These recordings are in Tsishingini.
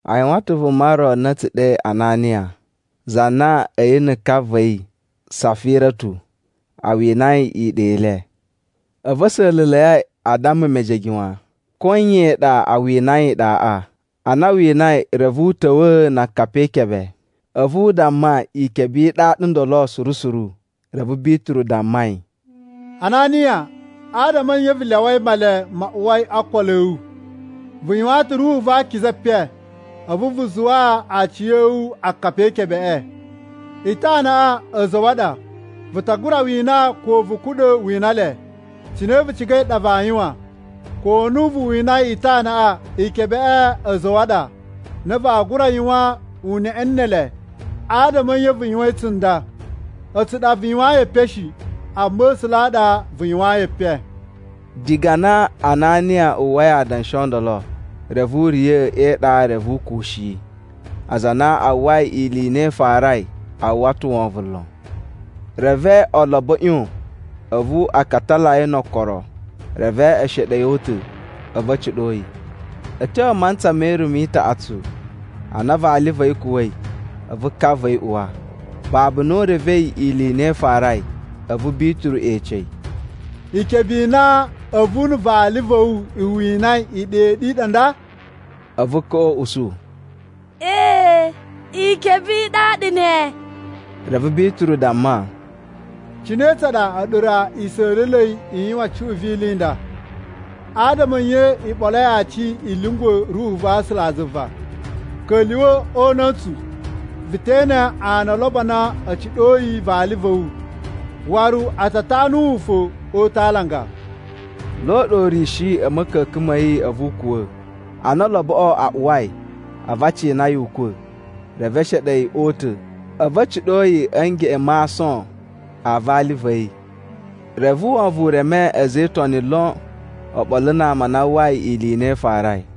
A yuwan ta̱ vuma ro na a̱ tsu ɗe Ananiya, za na a̱yi na̱ ka va̱ yi, Safiratu, a winai iɗa i le. A̱vu a̱ sa̱la̱la̱i a damma mejege wan ko iyan i ɗa a winai iɗaꞌa. Ana a winai reve u ta̱wa̱a̱ na akapi e ikebe, a̱vu u damma ikebe i ɗaɗa ndolo suru suru. Reve Bituru damma yi, “Ananiya adama a̱ nye vu lyawai Male ma uwai o okolo a̱ wu? Vu yuwaan ta̱ Ruhu va Akiza epen, a̱vu vu zuwaa aciya̱wu akapi e ikebeꞌe. Itanaꞌa a̱za̱ a̱ wu a ɗa vu ta gura wina ko vu kuɗa̱ wina le, cine vu cigai ɗa vaa yuwan. Ko na vu winai itanaꞌa, ikebeꞌe a̱za̱ a̱ wu a ɗa na vaa gura yuwan uneꞌe ne ele. Adama a̱ nye vu yuwain tsunda? A̱tsu ɗa vu yuwayin epen shi, amma A̱sula̱ a ɗa vu yuwayin epen.” Diga na Ananiya uwwai adanshi o ndolo, reve u riya̱ e iɗa reve u kuwushi. Aza a na a uwwai ili i na i farai, a uwwa ta̱ wovon lon. Reve olobo a̱ ꞌyon a̱vu a katala yi no okoro, reve e sheɗe yi o uta̱, a̱vu a̱ ciɗo yi. A̱ tyo a mantsa me irumu i taꞌatsu a na vali va̱ yi kuwa̱i, a̱vu ka va̱ yi uwa, babu na u revei ili i na i farai. A̱vu Bituru ece yi, “Ikebe i na a̱vu na̱ vali va̱ wu i winai iɗa i ɗu i ɗa nda?” A̱vu kaꞌa u usu, “Ee, ikebe i ɗaɗa ne.” Reve Bituru damma, “Cine tsa ɗa a̱ɗu ra i sa̱la̱la̱i i yuwan cuꞌun vi ili i nda? Adama a̱ nye i ɓoloi aci i lyungwa̱ Ruhu va̱ A̱sulazuva? Ka̱lyuwa̱ o una̱ntsu, vu te ene ana o olobo a na a̱ ciɗoi vali va̱ wu, waru a ta tanu wu fo o uta̱ a alanga.” Lo ɗa u riya̱shi a̱ ma̱ka̱ka̱n ma̱ yi a̱vu u kuwa̱. Ana oloboꞌo a uwai, a̱vu a cina yi ukwa̱. Reve e sheɗe yi o uta̱, a̱vu a̱ ciɗo yi a̱ ngeꞌen ma aason a vali va̱ yi. Reve wovon u reme a̱za̱ e Itoni lon oɓolo na ama a na a uwwai ili i na i farai.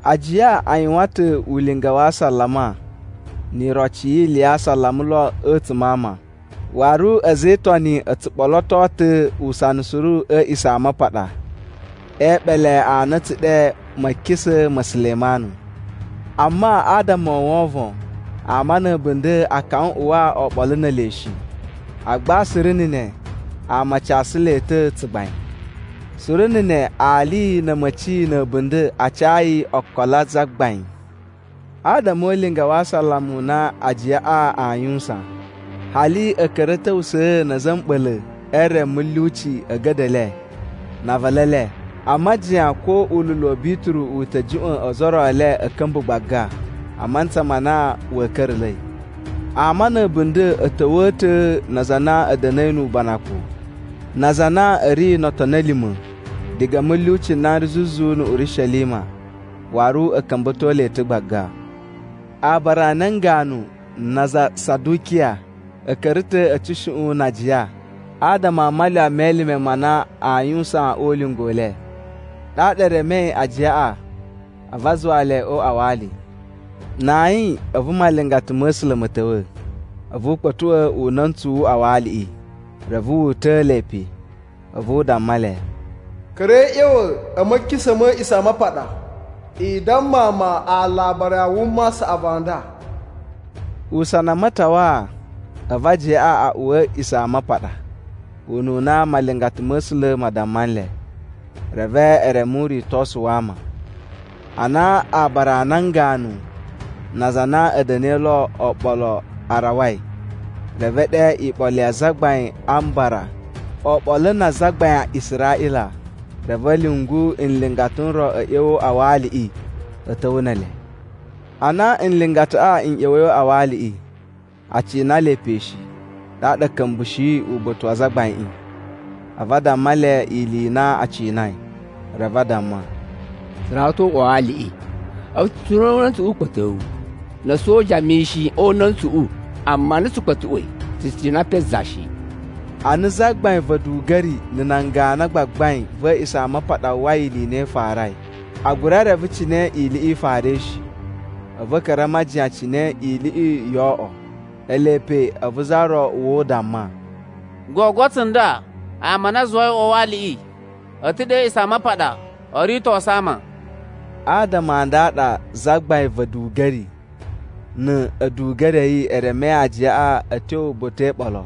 Ajiya a yuwan ta̱ ulinga wa asalama ni iroci yi ili ya asalama lon a̱tsuma̱ a ama. Waru a̱za̱ e Itoni o tsu ɓoloto ta̱ usana suru a̱ A̱a̱ꞌisamapaɗa e eɓele a na a̱ tsu ɗe Ma̱kisa̱ ma̱ Sulemanu. Amma, adama o wovon, ama na̱ a̱bunda̱ a kawan uwa oɓolo ne ele shi. Agba suru na̱ ne, ama a casu le ta̱ tsugbain. Suru na̱ ne ali na̱ a̱ma̱ci na̱ a̱bunda̱ a cayi okolo a Zagbain. Adama o ulinga wa asalama u na ajiyaꞌa aa yuwusan, hali a̱ ka̱ra̱ a̱ ta̱wusa̱a̱ na̱ a̱za̱ a̱ mɓa̱la̱ e re mulyuci a̱ a̱ga̱da̱ e le na a avalu e le, a majiyan ko ululu wa̱ Bituru u ta̱ juꞌwa̱n ozo o ro e le a̱ ka̱mba̱ gbaga a mantsa ma na wa̱a̱ ka̱ra̱la̱i. Ama na̱ a̱bunda̱ a̱ ta̱wa̱a̱ ta̱ na aza a na a̱ da̱na̱i nu ubanakun, na aza a na a̱ ri no otoni a̱ lima̱, diga mulyuci n na n ri zuzu na̱ Urishelima. Waru a̱ ka̱mba̱to le ta̱ gbaga. Aabara a nan ganu na aza a Sadukiya a̱ ka̱ra̱ ta̱ a̱ tsushuꞌun na ajiya adama a malyuwa me elime ma na aa yuwusan o ulinga u le. Ɗaɗa e remei ajiyaꞌa a̱vu a zuwa le o uꞌwa wa ali. Na ayin a̱vu malingata ma̱ A̱sula̱ ma̱ ta̱wa̱, a̱vu u kpa̱tuꞌwa̱ una̱ntsu wu uꞌwa wa aliꞌi, reve wu uta̱a̱ le pe. A̱vu u damma le, “Ka̱ra̱i a̱ ꞌya̱wa̱ a̱ ma̱kisa̱ ma̱ A̱a̱ꞌisamapaɗa, i damma ama alabari a wuma a saꞌavu a nda.” Usana a matawaa, a̱vu ajiyaꞌa a uwa a̱ A̱a̱ꞌisamapaɗa ununa malingata ma̱ A̱sula̱ ma damma nle, reve e reme uritosu wa ama. Ana aabara a nan ganu na aza a na a̱ da̱na̱i lo oɓolo a rawai, reve e ɗe iɓolo ya Azagbain a Mbara oɓolo na azagbain a Israꞌila. Reve a̱ lyungu nlingata n ro n ꞌya̱wa̱ o uꞌwa wa aliꞌi, a̱ ta̱wa̱ ne ele. Ana nlingataꞌa n ꞌya̱wa̱i o uꞌwa wa aliꞌi, a cina le pe shi, ɗaɗa a̱ ka̱mbushi uba̱ta̱ wa azagbaiꞌin, a̱vu a damma le ili i na a cinai. Reve a damma, “Tsu rawa ta̱ o uꞌwa wa aliꞌi, a̱vu tsu cina una̱ntsuꞌu ukpa̱towu, na̱ a̱soja mishin o una̱ntsuꞌu. Amma ana tsu katsuꞌwai, tsu cina pe za shi.” Ana zagbain va̱ a̱duga̱ri na̱ nan ganu a gbagbain va̱ A̱a̱ꞌisamapaɗa uwwai ili i na i farai, a gura reve cine iliꞌi i farai shi. A̱vu a̱ ka̱ra̱ a majiyan cine iliꞌi yoo oꞌwo. Ele pe a̱vu za ro uwa u damma, “Gogo tsunda ama a na i zuwai o uꞌwa wa aliꞌi a̱ ta̱ ɗe a̱ A̱a̱ꞌisamapaɗa o ritosu ama!” Adama a nda a ɗa zagbain va̱ a̱duga̱ri na̱ a̱duga̱ri a̱ yi e remei ajiyaꞌa a̱ tyo uba̱ta̱ e iɓolo.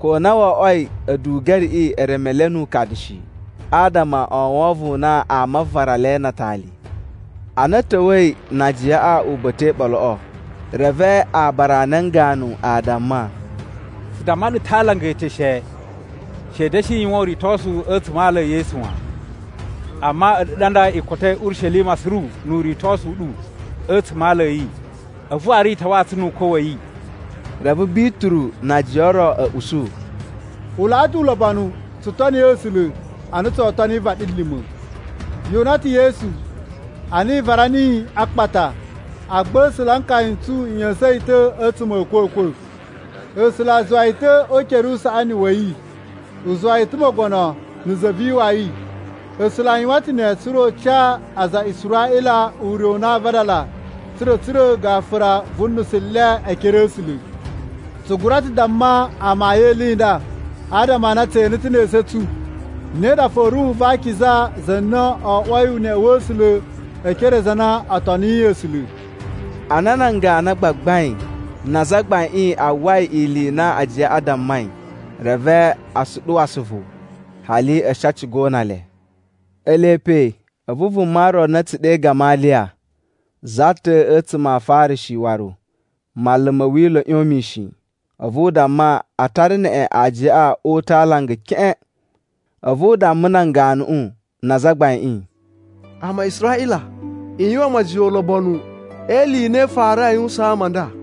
Ko na wo oꞌwoi a̱duga̱riꞌi e reme le nu ukadu shi, adama o wovon u na ama aa vara le na atali. Ana a̱ ta̱wa̱i na ajiyaꞌa uba̱ta̱ e iɓoloꞌo, reve aabara a nan ganu a damma, “Tsu damma ɗu ta̱ a alanga e eteshe, ‘She i da̱shi yuwan uritosu a̱tsuma̱ a ala e Yesu wan.’ Amma a̱ɗu ɗa nda i kotoi Urishelima suru nu uritosu u ɗu a̱tsuma̱ a ala a̱ yi, a̱vu waru i tawaa tsu nu ukwa̱ wa̱ yi.” Reve Bituru na ajiya o ro a̱ usu, “U laꞌa ta̱ ulobonu tsu toni A̱sula̱ a na tsoo toni vaɗilima̱. Yu una ta̱ Yesu ana i vara niyi a akpata, agba A̱sula̱ a nkaya n tsu a̱ ꞌya̱sa̱n yi ta̱ a̱tsuma̱ a̱ a̱kwa̱kwa̱. A̱sula̱ a zuwa yi ta̱ o ukere usaꞌani wa̱ yi u zuwa yi ta̱ Mogono na̱ Za vi Iwawi. A̱sula̱ a yuwan ta̱ ne, tsa̱ra̱ u ca aza a Israꞌila ure u na aa vadala tsa̱ra̱ a̱ tsura̱ gafura vu unusu u le e ekere a̱ A̱sula̱. Tsu gura ta̱ damma amayun e ili i nda, adama a na tse ene ta̱ ne esu a̱ tsu, ne ɗa fo Ruhu va Akiza, za na wo oꞌwoi uneꞌe wa̱ A̱sula̱ e ekere a aza a na o toniyi A̱sula̱.” Ana nan ganu a gbagbain na azagbaiꞌin a uwwai ili i na ajiyaꞌa a dammai, reve a suɗuwa asuvu. Hali a̱ shi a ciga o una le. Ele pe a̱vu vuma ro na a̱ tsu ɗe Gamaliya, za ta̱ a̱tsuma̱ a Afarishi waru manlu ma̱ Wila̱ ꞌyon mishin. A̱vu u damma a tara neꞌen ajiyaꞌa o uta̱ a alanga keꞌen. A̱vu u damma nan ganuꞌu na azagbaiꞌin, “Ama a Israꞌila, i yuwan majiyan ulobonu e ili i na i farai a yuwusaan ama a nda.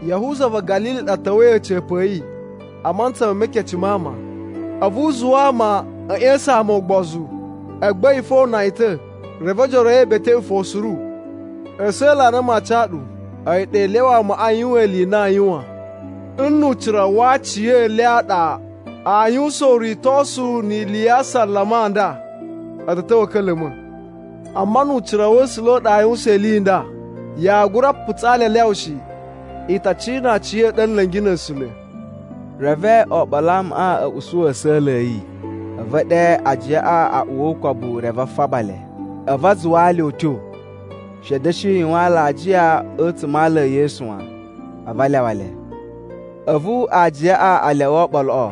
Yahuza va̱ Ga̱lili ɗa ta̱wa̱i a̱ca̱pa̱ a̱ yi a mantsa me mekece ma ama. A̱vu u zuwa ama a̱ ꞌya̱sa̱n ama ugbozu, agba a̱yi fo o una yi ta̱ reve ojoro a̱ yi e beteꞌwe fo suru. A̱sa̱la̱ a na maa ca ɗu, a̱yi ɗa i lyawa amaꞌa a yuwan ili i na aa yuwan. Nnu ucira wa aciyele a ɗa aa yuwusan uritosu ni ili ya asalama a nda, a̱ ta̱ ta̱wa̱ a̱ ka̱la̱ma̱. Amma nnu ucira wa̱ A̱sula̱ u ɗa aa yuwusan ili i nda, yaa gura putsaa le a lyawa shi. I ta cina aciya̱ɗu a̱ nla̱ngi na̱ A̱sula̱.” Reve oɓolo a amaꞌa a̱ usu a̱sa̱la̱ a̱ yi. A̱vu e ɗe ajiyaꞌa a uwa o ukobu reve a faba le. A̱vu a zuwaa le utyo, she a̱ da̱shi yuwan alajiya a̱tsuma̱ a ala e Yesu wan, a̱vu a lyawa le. A̱vu ajiyaꞌa a lyawa oɓoloꞌo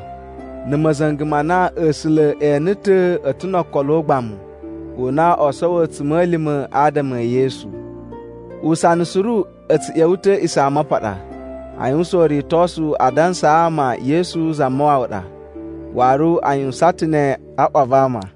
na̱ ma̱za̱nga̱ ma na A̱sula̱ e ene ta̱ a̱ ta̱ no okolo ugbamu u na o sowo a̱tsuma̱lima̱ adama e Yesu. Usana suru a̱ tsu ꞌya̱wa̱ ta̱ a̱ A̱a̱ꞌisamapaɗa a yuwusan uritosu a dansaa ama Yesu Zamawawa ɗa. Waru a yuwusan ta̱ ne a ꞌwa va ama.